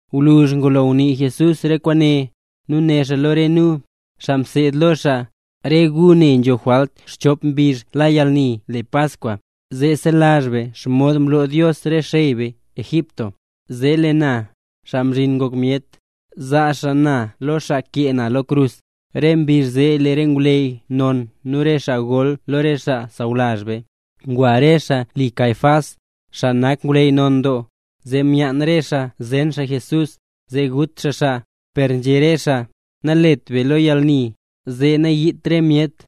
Gwluzh ngulo ngunii Jesús re kwaane, né xaa lo re nu, xaa mseed lo xaa: —Re gu ne nzho jwalt xchop mbizh la yalni kwaan le Paskwa, zee selazh be xomod mloo Dios re xey be Egipto. Zee lee na, Xaa Mzhin Ngok Myet, zaa xaa na lo xaa kee na lo krus. Re mbizh zee lee re ngwleyy non nu re xaa gol lo re xaa sawlazh be, ngwa re xaa li Caifás, xaa nak ngwleyy non doo. Zee myaan re xaa zen xaa Jesús, zee gut xaa xaa. Per nzhé re xaa: —Nalet beya lo yalni, zee nayiit re myet.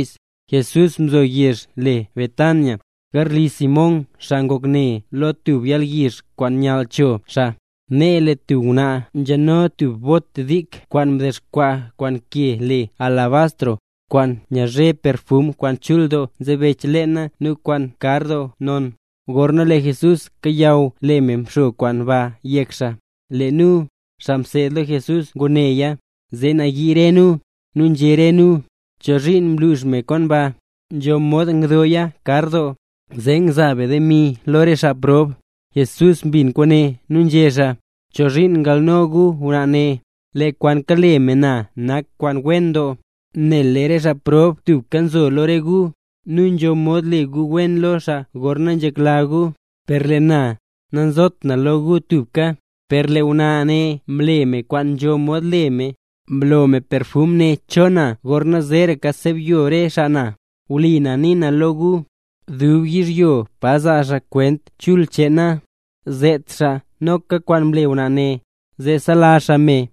Jesús nzo yezh le Betania, garli Simón, xaa ngok ne lo tub yalyizh kwaan nyall cho xaa. Nee lee tub ngwnaa nzhano tub bot dik kwaan mdexkwaa kwaan ke le alabastro, kwaan nyazhe perfum kwaan chul doo nzebech leena nu kwaan kar doo non. Gorna lee Jesús kayaw lee me mxo kwaan ba yek xaa. Lee nu, xaa mseed lo Jesús nguneya, zee nayii re nu, nu nzhé re nu: —¿Chozhiin mlux me kwaan ba? Nzho mod ngdooya kar doo, zee ngzaa be demi lo re xaa prob. Jesús mbin kwaane nu nzhé xaa: —¿Chozhiin ngalno gu ngwnaa ne? Lee kwaan kale me lo na nak kwaan wen doo. Nel lee re xaa prob tubka nzo lo re gu, nu nzho mod le gu wen lo xaa gorna nzhekla gu, per lee na, nazot na lo gu tubka. Per lee ngwnaa ne mle me kwaan nzho mod le me, mlo me perfum ne cho na gorna zeeraka sebyo re xaa na. Wlipa na nii na lo gu, dub yizhyo pa zaa xaa Kwent Chul cheen na, zet xaa noka kwaan mle ngwnaa ne, zee selazh xaa me.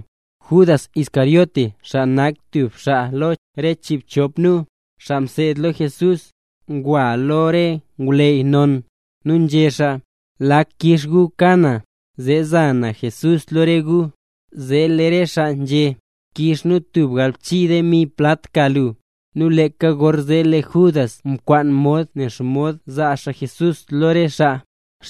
Judas Iscariote xaa nak tub xaa lo re chiibchop nu, xaa mseed lo Jesús, ngwa lo re ngwleyy non. Nu nzhé xaa: —¿Lak kix gu ka na, zee za na Jesús lo re gu? Zee lee re xaa nzhé: —Kix nu tub galbchii demi plat ka lu. Nu leeka gorzee lee Judas mkwaan mod ne xomod zaa xaa Jesús lo re xaa.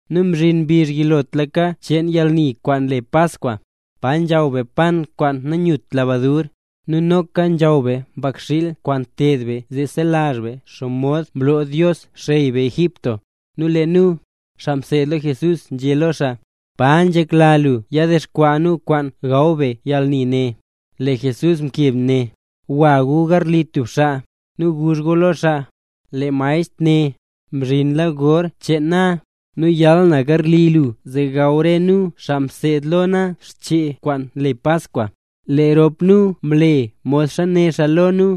Nu mzhin mbizh yilotlaka cheen yalni kwaan le Paskwa, pa nzhaw be pan kwaan nanyut lebadur. Nu noka nzhaw be mbakxiil kwaan nteed be zee nselazh be xomod mloo Dios xey be Egipto. Nu lee nu, xaa mseed lo Jesús nzhé lo xaa: —¿Pa nzhekla lu yadexkwaa nu kwaan gaw be yalni ne? Lee Jesús mkeb né: —Gwa gu garli tub xaa, nu guzh gu lo xaa: “Lee maestr né: ‘Mzhinla gor cheen na, nu yal na garli lu zee gaw re nu, xaa mseed lo na, xchee kwaan le Paskwa’”. Lee rop nu mle modxa né xaa lo nu.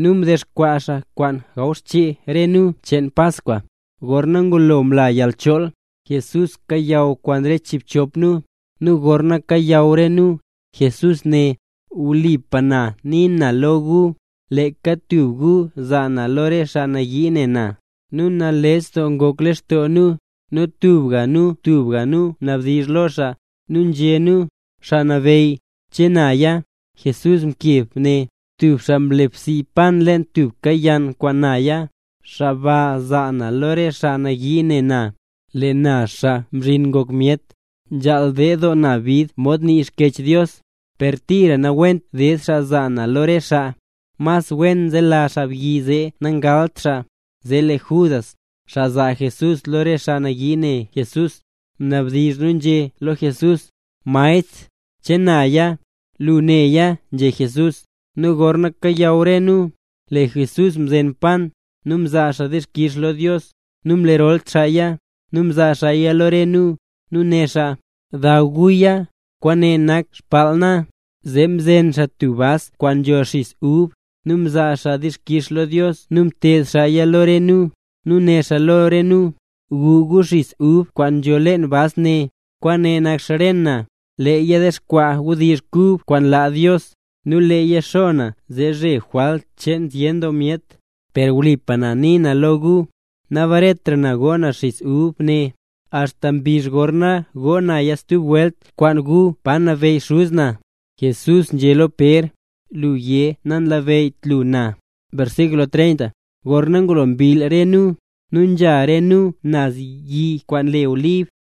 Nu mdexkwaa xaa kwaan gaw xchee re nu cheen Paskwa. Gorna ngulo mla yalchool, Jesús kayaw kwaan re chiibchop nu, nu gorna kayaw re nu, Jesús né: —Wlipa na nii na lo gu, leeka tub gu zaa na lo re xaa nayii ne na. Re nu nales doo ngok lextoo nu, nu tubga nu tubga nu nabdizh lo xaa, nu nzhé nu: —Xaa Nabeyy, ¿che naya? Jesús mkeb né: —Tub xaa nle bsii pan leen tubka yann kwaan naya, xaa ba zaa na lo re xaa nayii ne na. Lee na Xaa Mzhin Ngok Myet, nzhaal ded na doo bid mod nii Xkyech Dios, per tira nawent ded xaa zaa na lo re xaa. Mas wen nzela xaabyi zee nangalt xaa. Zee lee Judas, xaa zaa Jesús lo re xaa nayii ne Jesús, mnabdizh nu nzhé lo Jesús: —Maestr, ¿che naya? —Lu néya —nzhé Jesús. Nu gorna kayaw re nu, lee Jesús mzen pan, nu mzaa xaa dixkix lo Dios, nu mlerol xaaya, nu mzaa xaaya lo re nu. Nu né xaa: —Daw guya, kwaane nak xbaal na. Zee mzen xaa tub bas kwaan nzho xis ub, nu mzaa xaa dixkix lo Dios nu mted xaaya lo re nu, nu né xaa lo re nu: —Gu gu xis ub kwaan nzho leen bas ne. Kwaane nak xren na. Leeya dexkwaa wdizh kub kwaan laa Dios, nu leeya xo na zee zhe jwalt cheen zyen doo myet. Per wlipa na nii na lo gu, nabaretra na go na xiz ub ne, axta mbizh gorna go naya stub welt kwaan gu pa nabeyy Xuz na. Jesús nzhé lo Pér: “Lu yé, nanlabeyyt lu na” Gorna ngulo mbill re nu, nu nzha re nu naz yi kwaan le Olib.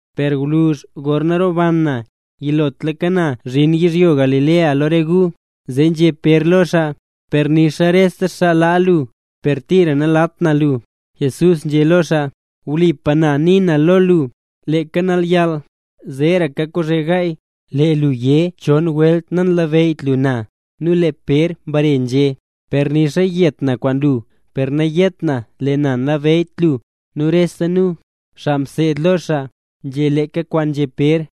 Per gwluzh gorna roban na, yilotlaka na zhin yizhyo Galilea lo re gu. Zee nzhé Pér lo xaa: —¡Per nixa rese xaa laa lu, per tira nalaat na lu! Jesús nzhé lo xaa: —Wlipa nii na lo lu, leeka nalyall, zeeraka kozhe gaay, lee lu yé chon welt nanlabeyyt lu na. Nu lee Pér mbare nzhé: —Per nixa yet na kwaan lu, per nayét na lee na nanlabeyyt lu. Nu rese nu, xaa mseed lo xaa, nzhé leeka kwaan nzhé Pér.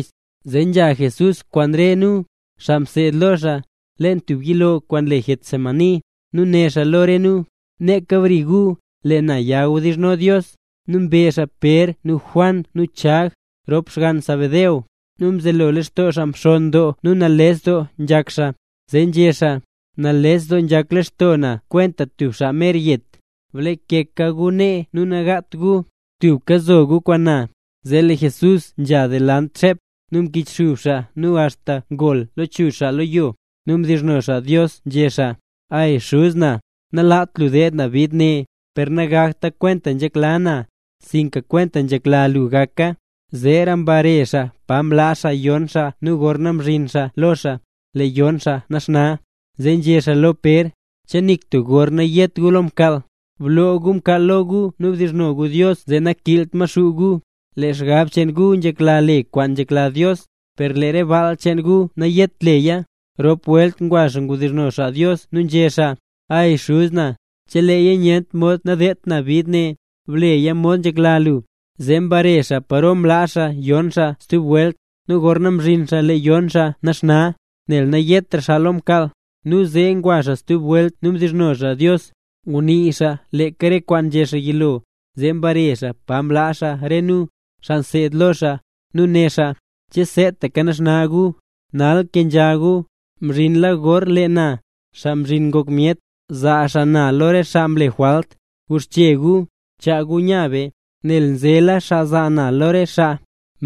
Zee nzha Jesús kwaan re nu, xaa mseed lo xaa, leen tub yilo kwaan le Getsemaní, nu né xaa lo re nu: —Neeka brika re gu, lee na ya wdizhno Dios. Nu mbe xaa Pér nu Juan nu Chag, rop xgann Zebedeo, nu mzelo lextoo xaa mxonn doo nu nales doo nzhak xaa. Zee nzhé xaa: —Nales doo nzhak lextoo na kwenta tub xaa mer yet. Blakeka gu nee nu nagaat gu, tubka zo gu kwaan na. Zee lee Jesús mze delant xep, nu mkichxub xaa nu axta ngol lechuzh xaa lo yo, nu mdizhno xaa Dios nzhé xaa: —¡Ay, Xuz na! Nalaat lu deed na bid ne, per nagakta kwentaxa nzhekla na, sinka kwentaxa nzhekla lu gaka. Zeera mbare xaa pa mlaa xaa yon xaa nu gorna mzhin xaa lo xaa; lee yon xaa naxna. Zee nzhé xaa lo Pér: —¿Che nik tub gor nayet gu lo mkaal? Blo gu mkaal lo gu nu bdizhno gu Dios zee nakiilt Maxuu gu. Lee xgab cheen gu nzhekla le kwaan nyakla Dios, per lee baal cheen gu nayet leya. Mrop welt ngwa xaa mbdizhno xaa Dios nu nzhé xaa: —¡Ay, Xuz na! Cheleeya nyent mod nadedt na bid ne, bleya mod nzhekla lu. Zee mbare xaa paro mlaa xaa yon xaa stub welt, nu gorna mzhin xaa lee yon xaa naxna, nel nayetra xaa lo mkaal. Nu zee ngwa xaa stub welt nu mdizhno xaa Dios. Ngunii xaa leeka re kwaan nzhé xaa yilo. Zee mbare xaa pa mlaa xaa re nu, xaa mseed lo xaa, nu né xaa: —¿Che seetaka naxna gu? ¡Nal kenzha gu! Mzhinla gor lee na, Xaa Mzhin Ngok Myet, zaa xaa na lo re xaa mle jwalt. Guxche gu, chaa gu nya be, nel nzela xaa zaa na lo re xaa.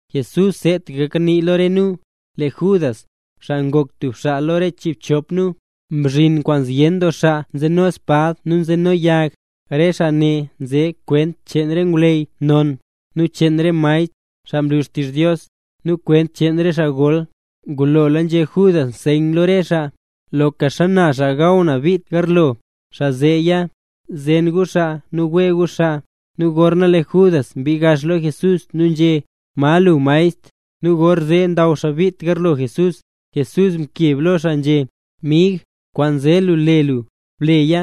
Jesús seetaka kanii lo re nu, lee Judas, xaa ngok tub xaa lo re chiibchop nu, mzhin kwaan zyen doo xaa nzeno spad nu nzeno yag. Re xaa ne nze kwent cheen re ngwleyy non, nu cheen re maestr, xaa nlu xtizh Dios, nu kwent cheen re xaa gol. Ngulola nzhé Judas nseyn lo re xaa: —Loka xana xaa gaw na bit garlo, xaa zeeya; zen gu xaa nu wee gu xaa. Nu gorzee lee Judas mbii gax lo Jesús nu nzhé: —¿Ma lu, Maestr? Nu gorzee ndaw xaa bit tagarlo Jesús. Jesús mkeb lo xaa nzhé: —Mig, kwaan nze lu le lu, bleya.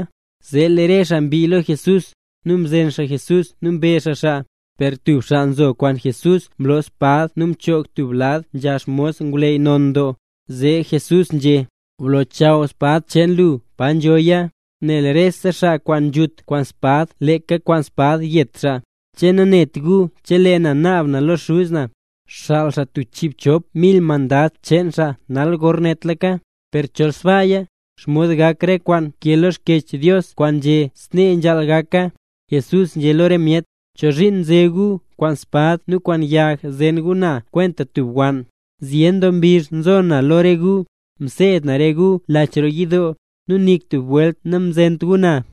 Zee lee re xaa mbii lo Jesús, nu mzen xaa Jesús nu mbe xaa xaa. Per tub xaa nzo kwaan Jesús mloo spad nu mchoog tub lad nzha xmos ngwleyy non doo. Zee Jesús nzhé: —Blochaw spad cheen lu pa nzhoya, nel rese xaa kwaan nzhut kwaan spad leeka kwaan spad yet xaa. ¿Che nanet gu chelee na naab na lo Xuz na, xaal xaa tub chiibchop mil mandad cheen xaa nal gornetlaka? Per chol sbaaya, ¿xomod gak re kwaan nkee lo Xkyech Dios kwaan nzhé snee nzhaal gaka? Jesús nzhé lo re myet: —¿Chozhiin nze gu kwaan spad nu kwaan yag zen gu na kwenta tub wann? Zyen doo mbizh mzo na lo re gu, mseed na re gu lach roo yidoo. Nu nik tub welt namzent gu na.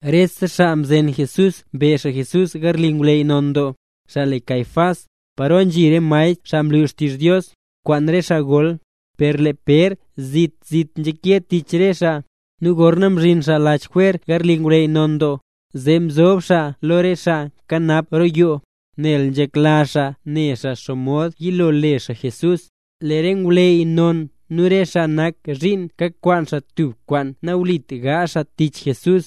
Re xaa mzen Jesús, mbe xaa Jesús garli ngwleyy non doo, xaa le Caifás, paro nzhi re maestr xaa nlu xtizh Dios, kwaan re xaa gol. Per lee Pér zit zit nzhake tich re xaa, nu gorna mzhin xaa lach jwer garli ngwleyy non doo, zee mzob xaa lo re xaa nkanap roo yoo, nel nzhekla xaa ne xaa xomod yilo le xaa Jesús. Lee re ngwleyy non nu re xaa nak zhiin kakwaan xaa tub kwaan nawlit gaazh xaa tich Jesús,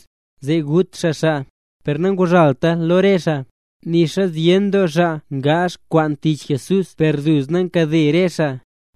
zee gut xaa Jesús. Per nanguzhaalta lo re xaa, nixa zyen doo xaa ngaazh kwaan tich Jesús per duzna nkade re xaa.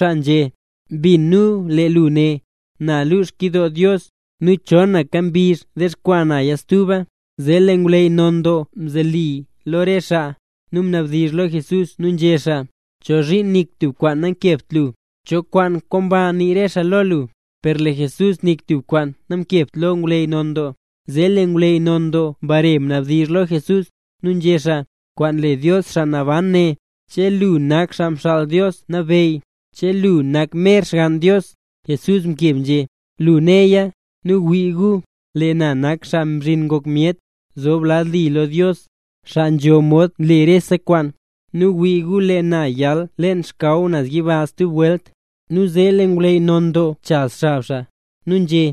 nzhé: —Mbin nu lee lu né: “Na lux xkyidoo Dios, nu chonaka mbizh dexkwaa na stuba”. Nu zee lee ngwleyy non doo mzoli lo re xaa, nu mnabdizh lo Jesús nu nzhé xaa: —¿Chozhiin nik tub kwaan namkebt lu? ¿Cho kwaan komba nii re xaa lo lu? Per lee Jesús nik tub kwaan namkebt lo ngwleyy non doo. Zee lee ngwleyy non doo mbare mnabdizh lo Jesús, nu nzhé xaa: —Kwaan le Dios xaa naban, né: ¿che lu nak Xaa Mxaal Dios Nabeyy? ¿Che lu nak mer Xgann Dios? Jesús mkeb nzhé: —Lu néya. Nu wii gu, lee na nak Xaa Mzhin Ngok Myet, zob lad li lo Dios, xaa nzho mod nle rese kwaan. Nu wii gu lee na yal leen xkaw naz yiba stub welt. Nu zee lee ngwleyy non doo mchaz xab xaa, nu nzhé: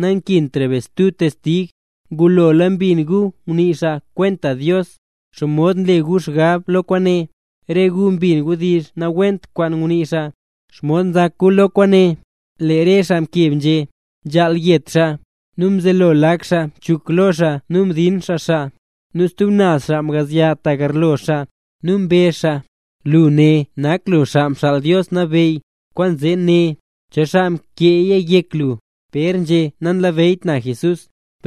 —¡Nankintra be stub testig! ¡Ngulola mbin gu ngunii xaa kwenta Dios! ¿Xomod nle gu xgab lo kwaane? Re gu mbin wdizh nawent kwaan ngunii xaa. ¿Xomod nzak gu lo kwaane? Lee re xaa mkeb, nzhé: —¡Nzhaal yet xaa! Nu mzelo lak xaa mchuk lo xaa nu mdin xaa xaa. Nu stub naz xaa mgazya ta garlo xaa. Nu mbezh xaa: —Lu né nak lu Xaa Mxaal Dios Nabeyy, kwaanzee né, ¿cho xaa mkeeya yek lu? Pér nzhé: “Nanlabeyyt na Jesús”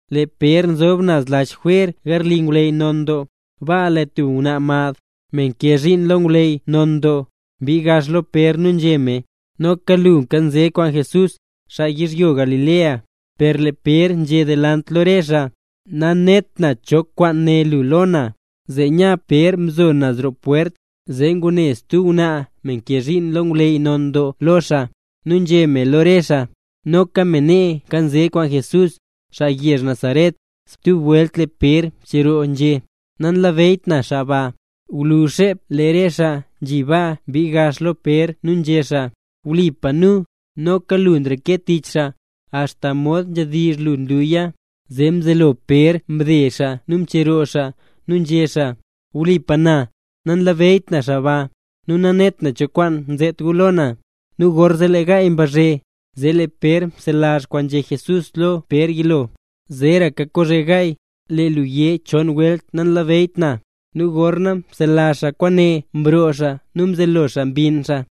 Lee Pér nzob naz lach jwer garli ngwleyy non doo. Baa lee tub ngwnaa mad, me nkee zhiin lo ngwleyy non doo, mbii gax lo Pér nu nzhé me: —Noka lu nkanze kwaan Jesús, xaa yizhyo Galilea. Per lee Pér nzhé delant lo re xaa: —Nanet na cho kwaan né lu lo na. Zee nya Pér mzo naz roo pwert, zee ngune stub ngwnaa me nkee zhiin lo ngwleyy non doo lo xaa, nu nzhé me lo re xaa: —Noka me nee nkanze kwaan Jesús, xaa yezh Nazaret. Stub welt lee Pér mcheroo, nzhé: —¡Nanlabeyyt na xaa ba! Gwluzh xep lee re xaa nzhi baa mbii gax lo Pér nu nzhé xaa: —Wlipa nu, noka lu nreke tich xaa, axta mod nzhadizh lu nluya. Zee mzelo Pér mde xaa nu mcheroo xaa, nu nzhé xaa: —¡Wlipa na, nanlabeyyt na xaa ba! ¡Nu nanet na cho kwaan zet gu lo na! Nu gorzee lee gaay mbazhe. Zee lee Pér mselazh kwaana nzhé Jesús lo Pér yilo: “Zeeraka kozhe gaay, lee lu yé chon welt nanlabeyyt na”. Nu gorna mselazh xaa kwaane, mroo xaa nu mzelo xaa mbinn xaa.